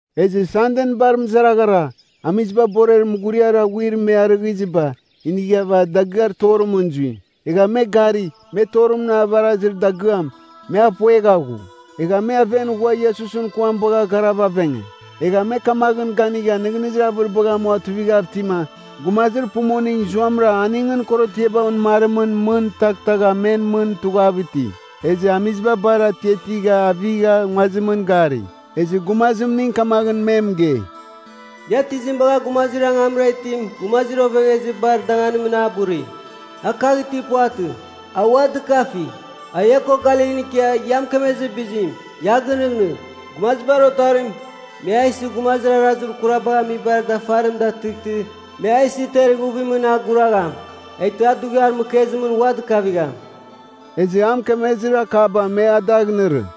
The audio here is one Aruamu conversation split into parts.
Ezɨ Sanden bar mɨzaraghara, amiziba borer mughuriar aghuir me arɨghɨziba, inighava dagɨar torimɨn zui. Egha me gari, me torim avarazir dagɨam, me a puegha ghu. Egha me aven ghua Iesusɨn kuam bagha garava avenge. Egha me kamaghɨn ganigha nɨghnɨzir avɨribagh amua tuivighav itima, gumazir pumuning zuamɨra aningɨn korotiaba onɨmarimɨn mɨn taghtagha men mɨn tughav iti. Ezɨ amiziba bar atiatigha avigha nguazimɨn gari, ezɨ gumazimning kamaghɨn me mɨgei, “Ia tizim bagha gumazir angamra itim gumazir ovengezibar danganimɨn a buri? A kagh itir puvatɨ; a ua dɨkafi! A ia ko Galilin ikia ia mɨkemezir bizim, ia a gɨnɨghnɨgh, ‘Gumazibar Otarim, me a isɨ gumazir arazir kurabagh amibar dafarim datɨghtɨ, me a isɨ ter ighuvimɨn a guragham. Eghtɨ a dughiar mɨkezimɨn ua dɨkavigham.’” Ezɨ a mɨkemezir akaba me a dagh inɨrɨ.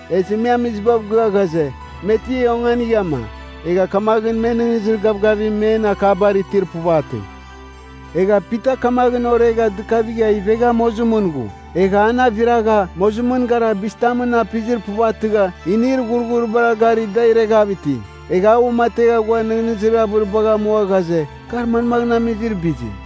Ezɨ me amizibav gɨa ghaze, me ti onganighama, egha kamaghɨn me nɨghnɨzir gavgavim men akabar itir puvatɨ. Egha Pita kamaghɨn oregha dɨkavigha ivegha mozimɨn ghu. Egha an aviragha, mozimɨn gara bizitamɨn apizir puvatɨgha inir ghurghuribara gari da ireghav iti. Egha a uamategha ghua nɨghnɨzir avɨribagh amua ghaze, kar manmaghɨn amizir bizim.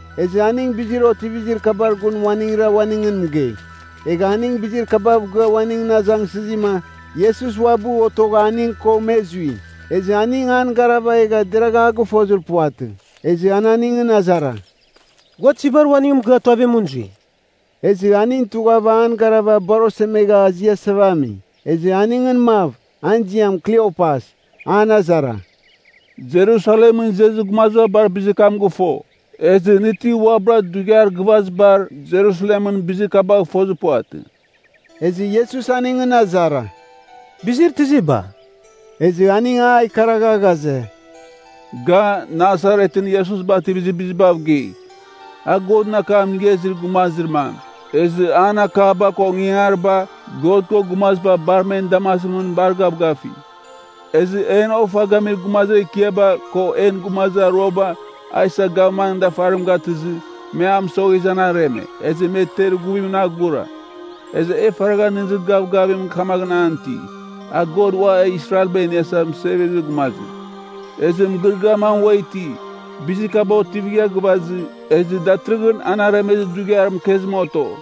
Ezɨ aning bizir otivizir kabar gun uaningra uaningɨn mɨgei. Egha aning bizir kabav gɨa uaningɨn azangsɨzima, Iesus uabɨ otogha aning ko me zui. Ezɨ aning an garava egha deragha a gɨfozir puvatɨ. Ezɨ an aningɨn azara, “Gua tizibar uaningɨn mɨgɨa tuavimɨn zui?” Ezɨ aning tughava an garava bar osemegha aziasava ami. Ezɨ aningɨn mav, an ziam Kliopas, an azara, “Jerusalemɨn izezir gumaziba bar bizir kam gɨfo. Ezɨ nɨ ti uabɨra dughiar gɨvazibar Jerusalemɨn bizir kabagh fozir puvatɨ?” Ezɨ Iesus aningɨn azara, “Bizir tiziba?” Ezɨ aning a ikaragha ghaze, “Ga Nasaretɨn Iesus bativizir bizibav gei. A Godɨn akam inigha izir gumazir mam, ezɨ an akaba ko ingangariba God ko gumaziba bar men damazimɨn bar gavgafi. Ezɨ en ofa gamir gumazir ekiaba ko en gumazir aruaba a isa gavmanɨn dafarim gatɨzɨ, me a mɨsoghezɨ an areme, ezɨ me ter ighuvimɨn a gura. Ezɨ e faragha nɨghnɨzir gavgavim kamaghɨn an iti, a God Ua Israelba Iniasa Mɨsevezir Gumazim. “Ezɨ mɨgɨrɨgɨar mam ua iti, bizir kaba otivigha gɨvazɨ, ezɨ datɨrɨghɨn an aremezir dughiar mɨkezim oto.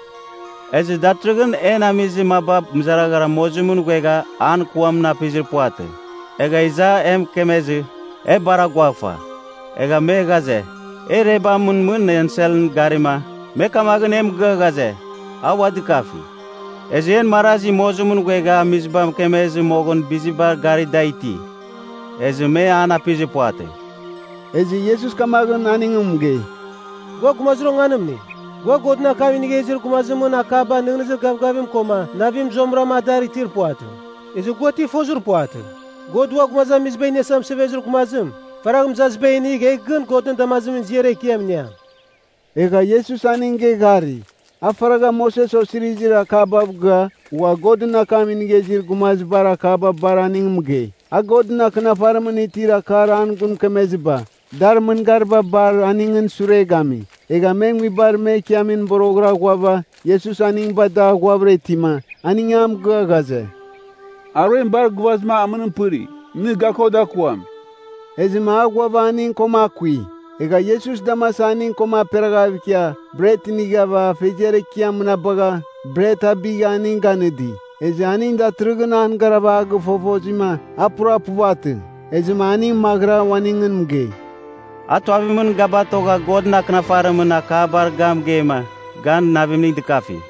Ezɨ datɨrɨghɨn en amizir maba mɨzaraghara mozimɨn ghuegha an kuamɨn apizir puvatɨ. Egha iza e mɨkemezɨ, e bar aguaghfa. Egha me ghaze, e irebamɨn mɨn enselbar garima, me kamaghɨn e mɨgɨa ghaze, a ua dɨkafi. Ezɨ en marazi mozimɨn ghuegha amiziba mɨkemezɨ moghɨn bizibar gari da iti, ezɨ me an apizir puvatɨ.” Ezɨ Iesus kamaghɨn aning mɨgei, “Gua gumazir onganimning! Gua Godɨn akam inigha izir gumazimɨn akaba nɨghnɨzir gavgavim koma navim zuamɨrama adar itir puvatɨ. Ezɨ gua ti fozir puvatɨ? God Ua Gumazamiziba Iniasa Mɨsevezir Gumazim, faragh mɨzaziba inigh egh gɨn Godɨn damazimɨn ziar ekiam iniam.” Egha Iesus aning geghari. A faragha Moses osirizir akabav gɨa, ghua Godɨn akam inigha izir gumazibar akaba bar aning mɨgei. A Godɨn Akɨnafarimɨn itir akar an gun mɨkemeziba, dar mɨngariba bar aningɨn sure gami. Egha me nguibar me ikiamimɨn boroghɨra ghuava, Iesus aning bada ghuavɨra itima, aning a mɨgɨa ghaze, “Aruem bar gɨvazɨma amɨnim pɨri. Nɨ ga ko dakuam.” Ezɨma a ghuava aning koma akui. Egha Iesus damasa aning koma aperaghav ikia, bret inighava Afeziar Ekiam mɨnabagha, bret abigha aning ganɨdi. Ezɨ aning datɨrɨghɨn an garava a gɨfofozima, a pura puvatɨ. Ezɨma aning maghɨra uaningɨn mɨgei, “A tuavimɨn ga batogha Godɨn Akɨnafarimɨn akabar ga mɨgeima, gan navimning dɨkafi.”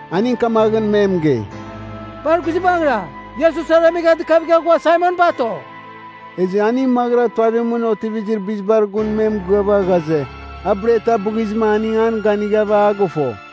aning kamaghɨn me mɨgei, “Bar guizbangɨra! Iesus aremegha dɨkavigha ghua Saimon bato!” Ezɨ aning maghɨra tuavimɨn otivizir bizibar gun me mɨgɨava ghaze, a bret abɨghizɨma aning an ganighava a gɨfo.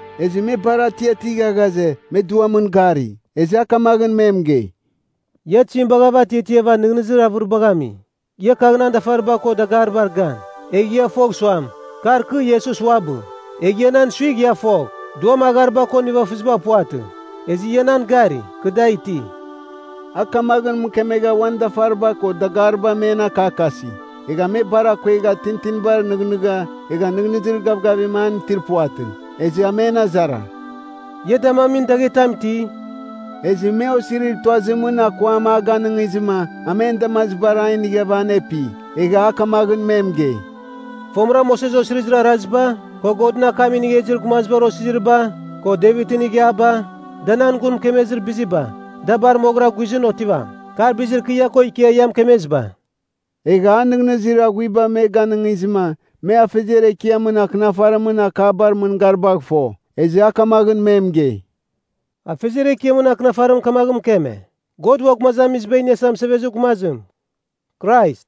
Ezɨ me bar atiatigha ghaze, me duamɨn gari. Ezɨ a kamaghɨn me mɨgei, “Ia tizim bagha atiatiava nɨghnɨzir avɨribagh ami? Ia kagh nan dafariba ko dagaribar gan. Egh ia fogh suam, kar kɨ Iesus uabɨ. Egh ia nan suigh ia fogh. Duam aghariba ko nivafɨziba puvatɨ. Ezɨ ia nan gari, kɨ da iti.” A kamaghɨn mɨkemegha uan dafariba ko dagariba men akakasi. Egha me bar akuegha tintinibar nɨghnɨgha, egha nɨghnɨzir gavgavim an itir puvatɨ. Ezɨ a men azara, “Ia damamin daghetam iti?” Ezɨ me osirir tuazimɨn akuam a ganɨngizɨma, a men damazibar a inighava anepi. Egha a kamaghɨn me mɨgei, “Fomɨra Moses Osirizir Araziba, ko Godɨn akam inigha izir gumazibar osiziriba, ko Devitɨn ighiaba, da nan gun mɨkemezir biziba, da bar moghɨra guizɨn otivam. Kar bizir kɨ ia ko ikia ia mɨkemeziba.” Egha a nɨghnɨzir aghuiba me ganɨngizɨma me Afeziar Ekiamɨn Akɨnafarimɨn akabar mɨngaribagh fo. Ezɨ a kamaghɨn me mɨgei, “Afeziar Ekiamɨn Akɨnafarim kamaghɨn mɨkeme, God Ua Gumazamiziba Iniasa Mɨsevezir Gumazim, Krais,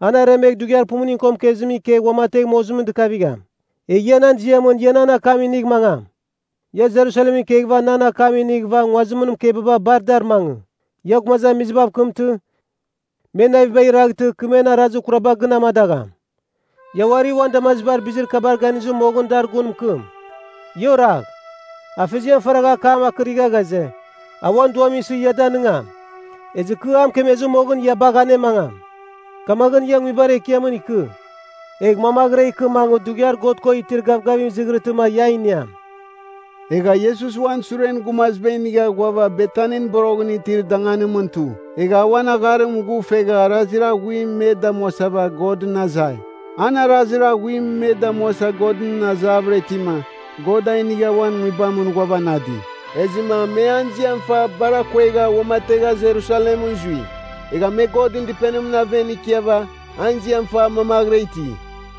an aremegh dughiar pumuning ko mɨkezimɨn ikegh uamategh mozimɨn dɨkavigham. Egh ia nan ziamɨn ia nan akam inigh mangam. Ia Jerusalem ikeghɨva nan akam inighɨva nguazimɨn mɨkebaba bar dar mangɨ. Ia gumazamizibav kɨmtɨ, me navibagh iraghtɨ kɨ men arazir kuraba gɨn amadagham. Ia uari uan damazibar bizir kabar ganizɨ moghɨn dar gun mɨkɨm. Ia oragh. Afeziam faragha akam akɨragha ghaze, a uan Duam isɨ ia danɨngam. Ezɨ kɨ a mɨkemezɨ moghɨn, ia bagh anemangam. Kamaghɨn ia nguibar ekiamɨn ikɨ. Egh mamaghɨra ikɨ mangɨ dughiar God ko itir gavgavim izighrɨtɨma ia a iniam.” Egha Iesus uan suren gumaziba inigha ghuava Betanin boroghɨn itir danganimɨn tu. Egha a uan agharim ghufegha arazir aghuim me damuasava Godɨn azai. An arazir aghuim me damuasa Godɨn azavɨra itima, God a inigha uan Nguibamɨn ghuavanadi. Ezɨma me an ziam fa bar akuegha uamategha Jerusalemɨn zui. Egha me Godɨn Dɨpenimɨn aven ikiava an ziam fa mamaghɨra iti.